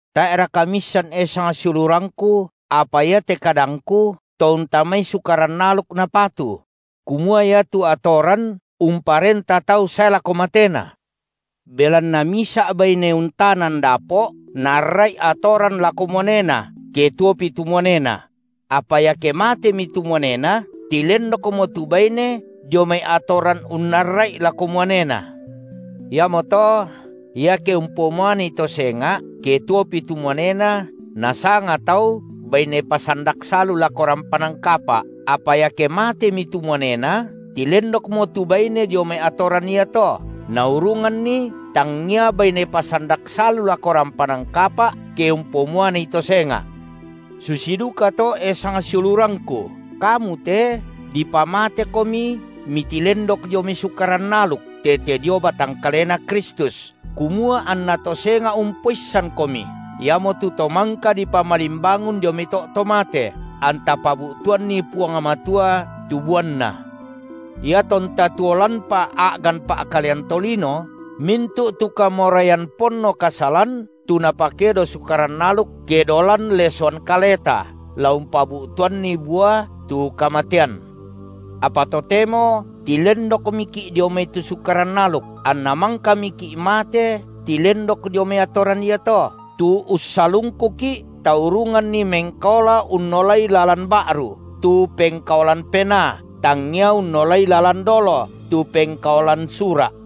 Tae’raka miissan, e sangsiulurangku – apa iate kadangku to untamai atoran Sukaran aluk napatu – kumua iatu atoran umparenta tau sae lako matena? Belanna misa’ baine untanan dapo’ naarra’i atoran lako muanena, ke tuopi tu muanena; apa iake matemi tu muanena, tilendokmo tu baine dio mai atoran unnarra’i lako muanena. Iamoto iake umpomuanei to senga’, ke tuopi tu muanena, nasanga tau baine pasandak salu lako rampanan kapa’, apa iake matemi tu muanena, tilendokmo tu baine dio mai atoran iato, naurunganni tangia baine pasandak salu lako rampanan kapa’, ke umpomuanei to senga’. Susi dukato, e sangsiulurangku, kamu te dipamatekomi mitilendok dio mai Sukaran aluk tete dio batang kalena Kristus, kumua anna to senga’ umpoissankomi, iamotu To mangka dipamalimbangun dio mai to’ to mate, anta pabu’tuanni Puang Matua tu buanna. Iatonta tuo lanpa a’gan pa’kalean tolino, mintu’ tu kamoraian ponno kasalan, tu napakedo Sukaran aluk, kedo lan lesoan kaleta la umpabu’tuanni bua tu kamatean. Apa totemo tilendokmiki’ dio mai tu Sukaran aluk, anna mangkamiki’ mate tilendok dio mai atoran iato, tu ussalungkuki’ taurunganni mengkaola unnolai lalan ba’ru, tu pengkaolan Penaa, tangia unnolai lalan dolo, tu pengkaolan sura’.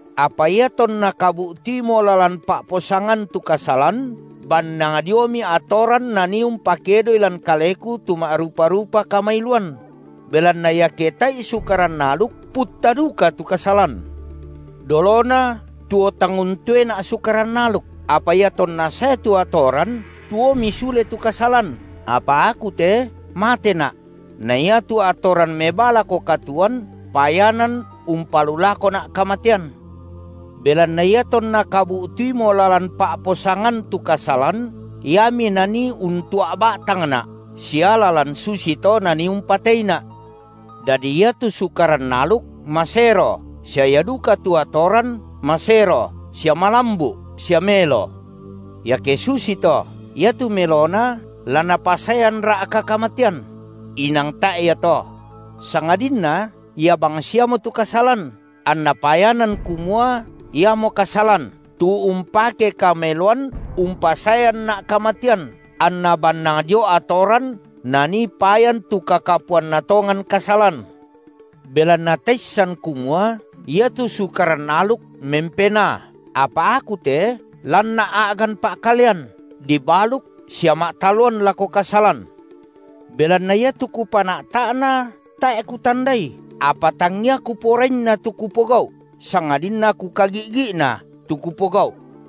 Apa iatonna kabu’tuimo lalan pa’posangan, tu kasalan bannang diomi atoran nanii umpakedoi lan kaleku tu ma’rupa-rupa kamailuan; belanna iake tae’i Sukaran aluk, putta duka tu kasalan. Dolona tuo tang untoena’ Sukaran aluk, apa iatonna sae tu atoran, tuomi sule tu kasalan, apa aku te matena’; na iatu atoran mebaa lako katuoan, payanan umpalulakona’ kamatean. Belanna iatonna kabu’tuimo lalan pa’posangan tu kasalan, iami nanii untua’ ba’tangna’ sia lalan susito nanii umpateina’. Dadi iatu Sukaran aluk masero sia ia duka tu atoran, masero sia malambu’ sia melo. Iake susito, iatu melona la napasaeanra’ka kamatean? Inang tae’ ia to! Sangadinna ia bangsiamo tu kasalan, anna payanan kumua iamo kasalan, tu umpake kameloan umpasaeanna’ kamatean, anna bannang dio atoran nanii payan tu kakapuanna tongan kasalan. Belanna taissan kumua iatu Sukaran aluk mempenaa, apa aku te lanna’ a’gan pa’kalean, dibaluk sia ma’taloan lako kasalan. Belanna iatu kupana’ta’na, tae’ kutandai apa tangia kuporainna tu kupogau’, sangadinna kukagi’gi’na, tu kupogau’.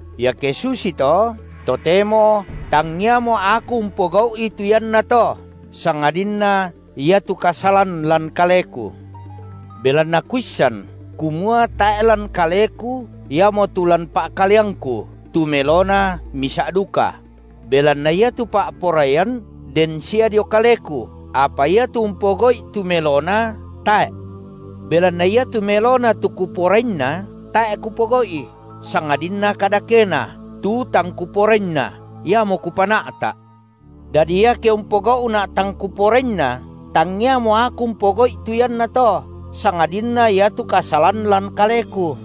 Iake susito, totemo tangiamo aku umpogau’i tu iannato, sangadinna iatu kasalan lan kaleku. Belanna kuissan, kumua tae’ lan kaleku iamotu lan pa’kaleangku, tu melona misa’ duka; belanna iatu pa’poraian den sia dio kaleku, apa iatu umpogau’i tu melona, tae’. Belanna iatu melona tu kuporainna, tae’ kupogau’i, sangadinna kadakena, tu tang kuporainna, iamo kupana’ta’. Dadi iake umpogau’na’ tang kuporainna, tangiamo aku umpogau’i tu iannato, sangadinna iatu kasalan lan kaleku.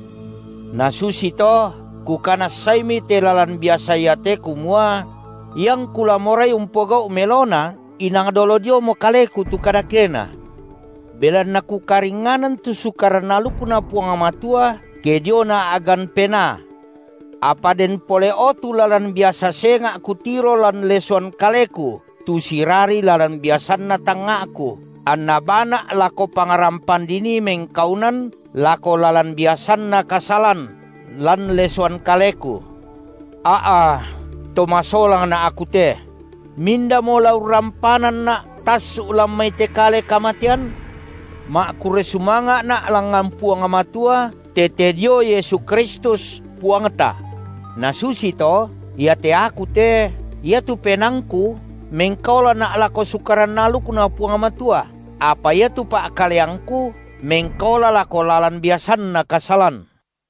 Na susito kukanassami te lalan biasa iate kumua: iangku la morai umpogau’ melona, inang dolo diomo kaleku tu kadakena. Belanna kukaringnganan tu Sukaran alukNa Puang Matua ke diona a’gan penaa, apa den pole’o tu lalan biasa senga’ kutiro lan lesoan kaleku tu sirari lalan biasanna tangnga’ku, anna baana’ lako pangrampan dinii mengkaunan lako lalan biasanna kasalan lan lesoan kaleku. A’a to masolangna’ aku te! Mindamo la urrampananna’ tassu’ lan mai te kale kamatean? Ma’kurre sumanga’na’ langngan Puang Matua tete dio Yesu Kristus, Puangta! – Na susito, iate aku te iatu penaangku mengkaolana’ lako Sukaran alukNa Puang Matua, apa iatu pa’kaleangku mengkaola lako lalan biasanna kasalan.